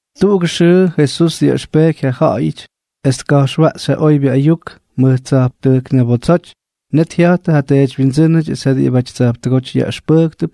Tuꞌugʉ xʉʉ Jesús dyaꞌʉxpeky ja ja̱ꞌa̱yʉty es tka̱jxwaꞌxy ja oybyʉ ayuk mʉj tsa̱jptʉjk ñabotsoty, net jya̱jttʉ ja teedywyindsʉ́nʉty es ja diꞌibʉty tsa̱jptʉgóty yaꞌʉxpʉjktʉp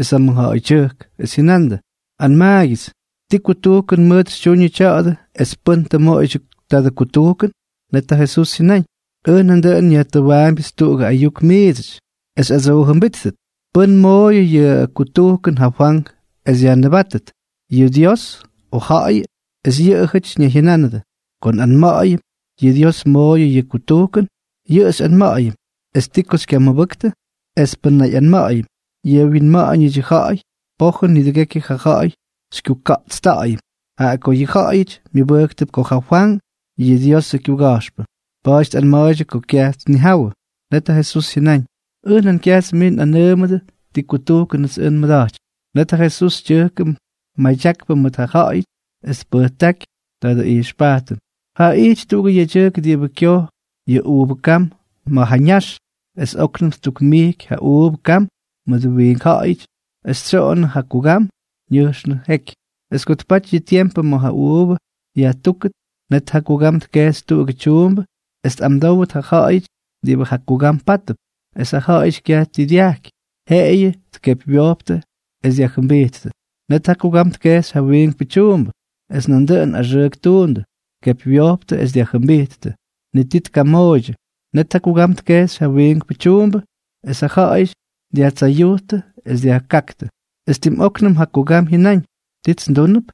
es ja mʉjja̱ꞌa̱ydyʉjk, es jyʉnandʉ: —Anmaagyʉts, ¿ti kutujkʉn mʉʉt xytyuñʉ tya̱a̱dʉ es pʉ́n tʉ mmoꞌoyʉdyʉ tadʉ kutujkʉn? Net ja Jesús jyʉnáñ: —Ʉj nandʉꞌʉn nyajtʉwaambyʉts tuꞌugʉ ayuk miidsʉty, es xyꞌadsoojʉmbíttʉt. ¿Pʉ́n mooyʉ yʉ kutujkʉn ja Fwank es yajnʉbátʉt, yʉꞌʉ Diosʉ, o ja̱ꞌa̱yʉ? Es yʉꞌʉjʉty ñayjyʉnánʉdʉ: —Ko nꞌanma̱ꞌa̱yʉm: “Yʉꞌʉ Dios mooyʉ yʉ kutujkʉn, yʉꞌʉ xyꞌanma̱ꞌa̱yʉm: ¿Es ti ko xykyamʉbʉktʉ? Es pʉn nꞌanma̱ꞌa̱yʉm: Yʉꞌʉ wyinma̱ꞌa̱ñʉdyʉ ja̱ꞌa̱y, pojʉn nidʉgekyʉ yʉ ja̱ꞌa̱y xykyuka̱ꞌtsta̱ꞌa̱yʉm, jaꞌa ko yʉ ja̱ꞌa̱yʉty myʉbʉjktʉp ko ja Fwank yʉꞌʉ Diosʉ kyuga̱jxpʉ.” Pa̱a̱ty tꞌanma̱a̱ydyʉ ko kyaj tnijawʉ. Net ja Jesús jyʉnáñ: —Ʉj nan kyajts miits nꞌanʉʉmʉdʉ ti kutujkʉnʉts ʉj nmʉda̱jtypy. Net ja Jesús tyʉjkʉ madyakpʉ mʉt ja ja̱ꞌa̱yʉty, es tpʉjtákyʉ tadʉ ijxpajtʉn: —Jaa ijty tuꞌugʉ yedyʉjk diꞌibʉ kyoj yʉ uuvʉ kam ma̱ ja ñax. Es óknʉm ttukmijky ja uuvʉ kam mʉdʉ wiink ja̱ꞌa̱yʉty es tsyoꞌonnʉ ja kugam, ñʉjxnʉ jeky. ’Es ko tpaty yʉ tiempʉ ma̱ ja uuvʉ yajtúkʉt, net ja kugam tkejxy tuꞌugʉ tyuumbʉ es tꞌamdówʉt ja ja̱ꞌa̱yʉty diꞌibʉ ja kugam pátʉp. Es ja ja̱ꞌa̱yʉty kyaj ti dyajky, jeꞌeyʉ tkepywyojptʉ es dyajjʉmbijttʉ. Net ja kugam tkejxy ja wiinkpʉ tyuumbʉ. Es nandʉꞌʉn axʉʉk ttuundʉ, tkepywyojptʉ es dyajjʉmbijttʉ. Ni ti tkamooydyʉ. Net ja kugam tkejxy jawiinkpʉ tyuumbʉ, es ja ja̱ꞌa̱yʉty dyajtsayujttʉ es dyajkáktʉ. ’Es tim óknʉm ja kugam jyʉnáñ: “¿Tits ndúnʉp?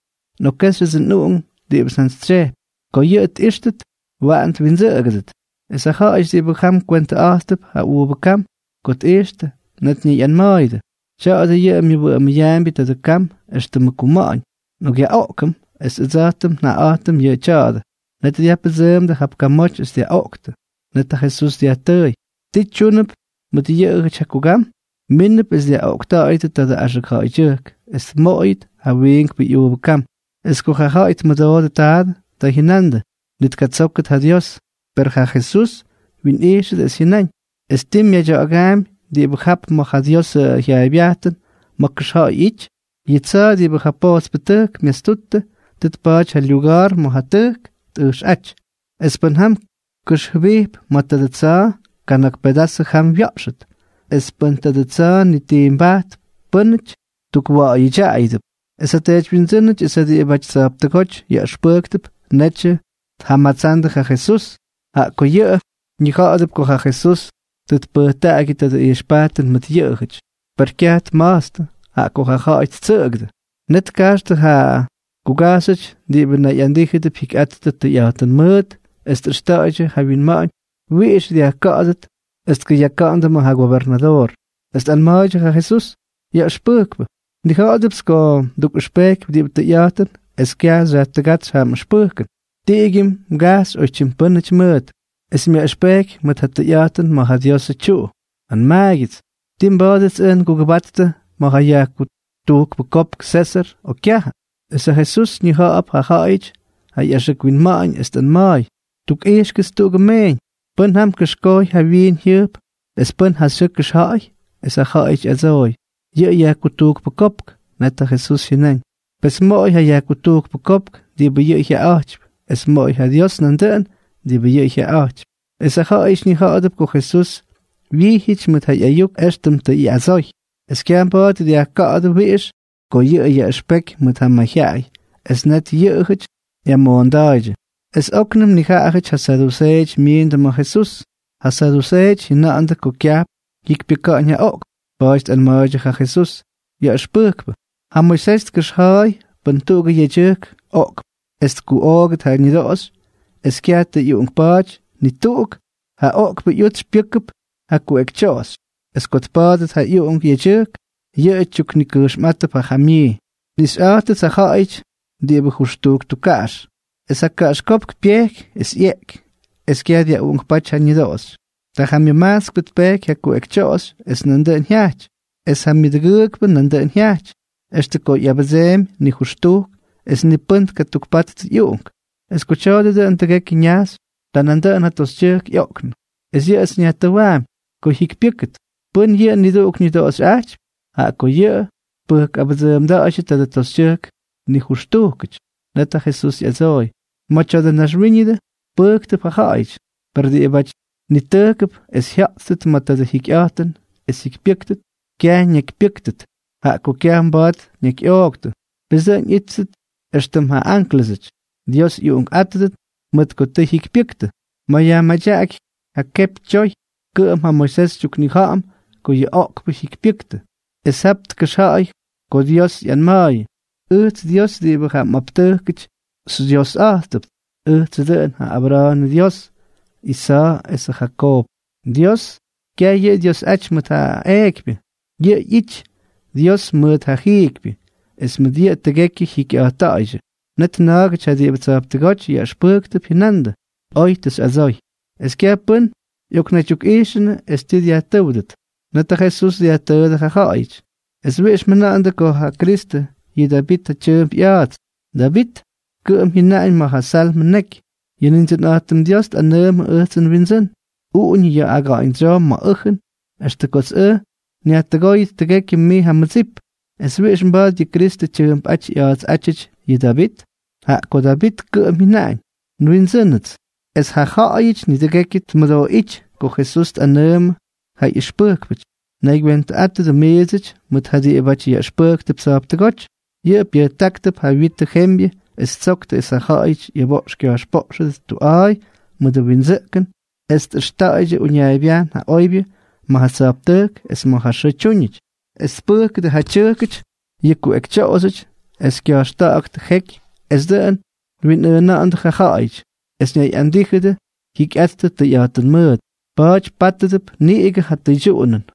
Nꞌokkéxyʉdsʉ nꞌuꞌunk diꞌibʉts njantsytsyejpy. Ko yʉꞌʉ tꞌíxtʉt, waꞌan twindsʉꞌʉgʉdʉt.” Es ja ja̱ꞌa̱yʉty diꞌibʉ jam kywentʉꞌa̱jttʉp ja uuvʉ kam, ko tꞌijxtʉ, net ñayꞌanma̱a̱yʉdʉ: “Tya̱a̱dʉ yʉꞌʉ myʉwʉꞌʉmʉyaambyʉ tadʉ kam éxtʉmʉ kuma̱ꞌa̱ñ. Nꞌokꞌyaꞌoꞌkʉm es ʉdsa̱jtʉm njaꞌaꞌa̱jtʉm yʉ tya̱a̱dʉ.” Net dyajpʉdsʉʉmdʉ jap kamoty es dyaꞌoꞌktʉ. Net ja Jesús dyajtʉʉy: —¿Ti tyúnʉp mʉt yʉꞌʉjʉty ja kugam? Mínʉp es dyaꞌoꞌkta̱ꞌa̱yʉdʉ tadʉ axʉk ja̱ꞌa̱ydyʉjk, es tmoꞌoyʉt ja wiinkpʉ ꞌyuuvʉ kam. Es ko ja ja̱ꞌa̱y tmʉdoodʉ taadʉ, ta jyʉnandʉ: —¡Ni tkatsókʉt ja Dios! Per ja Jesús wyinꞌijxʉdʉ, es jyʉnáñ: —¿Es ti myaydya̱ꞌa̱gaampy diꞌibʉ jap ma̱ ja Diosʉ jyaaybyajtʉn ma̱ kʉxja̱ꞌa̱y ꞌyity?: Yʉ tsa̱a̱ diꞌibʉ ja pojtspʉtʉjk myastutʉ, tʉ tpa̱a̱ty ja lyuga̱a̱r ma̱ ja tʉjk tꞌʉjxꞌáty. Es pʉ́n jam kʉxjʉbijp ma̱ tadʉ tsa̱a̱, kana̱k pedazʉ jam wya̱ꞌxʉt. Es pʉn tadʉ tsa̱a̱ nitimpajtʉp pʉ́nʉty, tukwa̱ꞌa̱yʉdyaꞌayʉdʉp. Es ja teedywyindsʉ́nʉty es ja diꞌibʉty tsa̱jptʉgóty yaꞌʉxpʉjktʉp netyʉ tjamatsandʉ ja Jesús, jaꞌa ko yʉꞌʉ ñija̱ꞌa̱dʉp ko ja Jesús tʉ tpʉjtaꞌagyʉ tadʉ ijxpajtʉn mʉt yʉꞌʉjʉty. Per kyaj tma̱jtstʉ, jaꞌa ko ja ja̱ꞌa̱y ttsʉꞌʉgʉdʉ. Net tkajxtʉ ja kugajxyʉty diꞌibʉ nayꞌandíjʉdʉp jyikyꞌattʉ tʉyꞌa̱jtʉn mʉʉt, es tꞌʉxta̱a̱ydyʉ ja winma̱ꞌa̱ñ wiꞌix dyajka̱ꞌa̱dʉt es tkʉyaka̱ꞌa̱ndʉ ma̱ ja gobernadoor. Es tꞌanma̱a̱ydyʉ ja Jesús: —Yaꞌʉxpʉjkpʉ, nnija̱ꞌa̱dʉpts ko mdukꞌʉxpeky diꞌibʉ tʉyꞌa̱jtʉn es kyaj xyajtʉgátsy ja mꞌʉxpʉjkʉn, tiꞌigyʉ mgajpxy oypyʉ́nʉty mʉʉt, es myaꞌʉxpeky mʉt ja tʉyꞌa̱jtʉn ma̱ ja Diosʉ tyuꞌu. Anmaagyʉts, ¿tii mba̱a̱dʉts ʉj ngugʉbattʉ ma̱ ja yajkutujkpʉ kopk Sésʉr, o kyajʉ? Es ja Jesús ñija̱ꞌa̱p ja ja̱ꞌa̱yʉty ꞌyaxʉk winma̱ꞌa̱ñ es tꞌanma̱a̱y: —Tukꞌijxkʉts tuꞌugʉ meeñ. ¿Pʉ́n jam kʉxkojy ja wyiin jyʉjp es pʉ́n ja xyʉʉ kʉxja̱ꞌa̱y? Es ja ja̱ꞌa̱yʉty ꞌyadsooy: —Yʉꞌʉ yajkutujkpʉ kopk. Net ja Jesús jyʉnáñ: —Pes moꞌoy ja yajkutujkpʉ kopk diꞌibʉ yʉꞌʉ jyaꞌaꞌa̱jtypy, es moꞌoy ja Dios nandʉꞌʉn diꞌibʉ yʉꞌʉ jyaꞌaꞌa̱jtypy. Es ja ja̱ꞌa̱yʉty ñija̱ꞌa̱dʉp ko Jesús wyijyʉty mʉt ja ꞌyayuk éxtʉm tʉ ꞌyadsoy. Es kyaj mba̱a̱t dyajka̱ꞌa̱dʉ wiꞌix ko yʉꞌʉ yaꞌʉxpeky mʉt ja mayjyaꞌay, es net yʉꞌʉjʉty ꞌyamoonda̱a̱ydyʉ. Es óknʉm nijaꞌajʉty ja saduseeʉty myiindʉ ma̱ ja Jesús. Ja saduseeʉty jyʉna̱ꞌa̱ndʉ ko kyajp jyikypyʉka̱ꞌa̱ñ ja oꞌkpʉty. Pa̱a̱ty tꞌanma̱a̱ydyʉ ja Jesús: —Yaꞌʉxpʉjkpʉ, ja Moisés tkʉxja̱a̱y pʉn tuꞌugʉ yedyʉjk oꞌkp es tkuꞌoogʉt ja ñʉdoꞌoxy es kyaj tʉ ꞌyuꞌunkpa̱a̱ty ni tuꞌuk, ja oꞌkpʉ ꞌyutsy pyʉ́kʉp ja kuꞌekytyoꞌoxy. Es ko tpa̱a̱dʉt ja ꞌyuꞌunk yedyʉjk, yʉꞌʉ tyuknikʉjxmꞌátʉp ja jamyii. Nꞌixyꞌa̱jtʉts ja ja̱ꞌa̱yʉty diꞌibʉ nijʉxtujk tukkaꞌax. Es ja kaꞌaxkópk pyejky, es ꞌyeꞌky, es kyaj dyaꞌuꞌunkpáty ja ñʉdoꞌoxy. Ta ja myʉmajtskpʉ tpejky ja kuꞌekytyoꞌoxy es nandʉꞌʉn jyajty. Es ja myʉdʉgʉʉkpʉ nandʉꞌʉn jyajty. Extʉ ko ꞌyabʉdseemy nijʉxtujk, es ni pʉ́n tkatukpattʉ ꞌyuꞌunk. Es ko tya̱a̱dʉ dʉꞌʉn tʉgekyʉ ñajxy, ta nandʉꞌʉn ja toxytyʉjk ꞌyoꞌknʉ. Es yʉꞌʉts nyajtʉwaampy. Ko jyikypyʉ́kʉt, ¿pʉ́nʉk yʉꞌʉ niduꞌuk ñʉdoꞌoxyꞌajtypy?, jaꞌa ko yʉꞌʉ tpʉjkꞌabʉdsʉʉmda̱a̱ydyʉ tadʉ toxytyʉjk nijʉxtujkʉty. Net ja Jesús ꞌyadsooy: —Ma̱ tya̱dʉ naxwíñʉdʉ, pʉjktʉp ja ja̱ꞌa̱yʉty, per diꞌibáty nitʉjkʉp es jya̱ꞌttʉt ma̱ tadʉ jikyꞌa̱jtʉn es jyikypyʉ́ktʉt, kyaj ñakypyʉ́ktʉt, jaꞌa ko kyaj mba̱a̱t ñakyꞌooktʉ. Pes dʉꞌʉn ꞌyíttʉt éxtʉm ja ánklʉsʉty, Dios ꞌyuꞌunkꞌátʉdʉt, mʉt ko tʉ jyikypyʉktʉ. Ma̱ yajmadyaꞌaky ja kepy tyoy, kʉꞌʉm ja Moisés xytyuknija̱ꞌa̱m ko yʉ oꞌkpʉ jyikypyʉktʉ. Es jap tkʉxja̱a̱y ko Dios ꞌyanma̱a̱yʉ: “Ʉjts Dios diꞌibʉ ja mꞌaptʉjkʉty xyDyiosꞌa̱jtʉpts. Ʉjtsʉ dʉꞌʉn ja Abra̱a̱nʉ Dyios, Isa̱a̱ esʉ Jakoob.” Dios, kyaj yʉꞌʉ Dyiosꞌaty mʉt ja eekypyʉ. Yʉꞌʉ ꞌyity Dios mʉt ja jiikypyʉ. Es mʉt yʉꞌʉ tʉgekyʉ jyikyꞌa̱jtta̱ꞌa̱ydyʉ. Net na̱a̱gʉty ja diꞌibʉ tsa̱jptʉgóty yaꞌʉxpʉjktʉp jyʉnandʉ: —Oy tʉ xyꞌadsoy. Es kyaj pʉ́n ꞌyoknaydyukꞌaꞌijxʉnʉ es tii tnakyyajtʉ́wdʉt. Net ja Jesús dyajtʉʉdʉ jaꞌajʉty: —¿Es wiꞌix mjʉna̱ꞌa̱ndʉ ko ja Kristʉ yʉꞌʉ Davit ja tyʉʉmp ꞌya̱a̱ts? Davit kʉꞌʉm jyʉnaꞌañ ma̱ ja Salmʉ neky: Yʉ Nindsʉnꞌa̱jtʉm Dios tꞌanʉʉmʉ ʉjtsʉ nWindsʉ́n: “Uꞌuñʉ ya̱a̱ aga̱ꞌa̱ñdsyoo ma̱ ʉjʉn extʉ kots ʉj nyajtʉgóyʉt tʉgekyʉ mij ja mmʉdsip.” ¿Es wiꞌix mba̱a̱t yʉ Kristʉ tyʉʉmpꞌáty ꞌya̱a̱tsꞌátyʉty yʉ Davit?, jaꞌa ko Davit kʉꞌʉm jyʉnáñ: “NWindsʉ́nʉts.” Es ja ja̱ꞌa̱yʉty nidʉgekyʉ tmʉdooꞌíty ko Jesús tꞌanʉʉmʉ ja ꞌyʉxpʉjkpʉty: —Naygywentʉꞌátʉdʉ miidsʉty mʉʉt ja diꞌibʉty yaꞌʉxpʉjktʉp tsa̱jptʉgóty. Yʉꞌʉ pyʉjtáktʉp ja witʉ yembyʉ, es ttsoktʉ es ja ja̱ꞌa̱yʉty ꞌyʉboꞌx kya̱jxpoꞌxʉdʉt tuꞌa̱a̱y mʉdʉ windsʉꞌkʉn es tꞌʉxta̱ꞌa̱ydyʉ uñaaybyajn ja oybyʉ ma̱ ja tsa̱jptʉjk es ma̱ ja xʉʉ tyúñʉty, es tpʉjkʉdʉ ja tyʉjkʉty yʉ kuꞌekytyoꞌoxyʉty, es kya̱jxta̱ꞌa̱ktʉ jeky es dʉꞌʉn twinꞌʉʉna̱ꞌa̱ndʉ ja ja̱ꞌa̱yʉty, es ñayꞌandíjʉdʉ jyikyꞌattʉ tʉyꞌa̱jtʉn mʉʉt. Pa̱a̱ty pátʉdʉp niꞌigʉ ja tʉydyuꞌunʉn.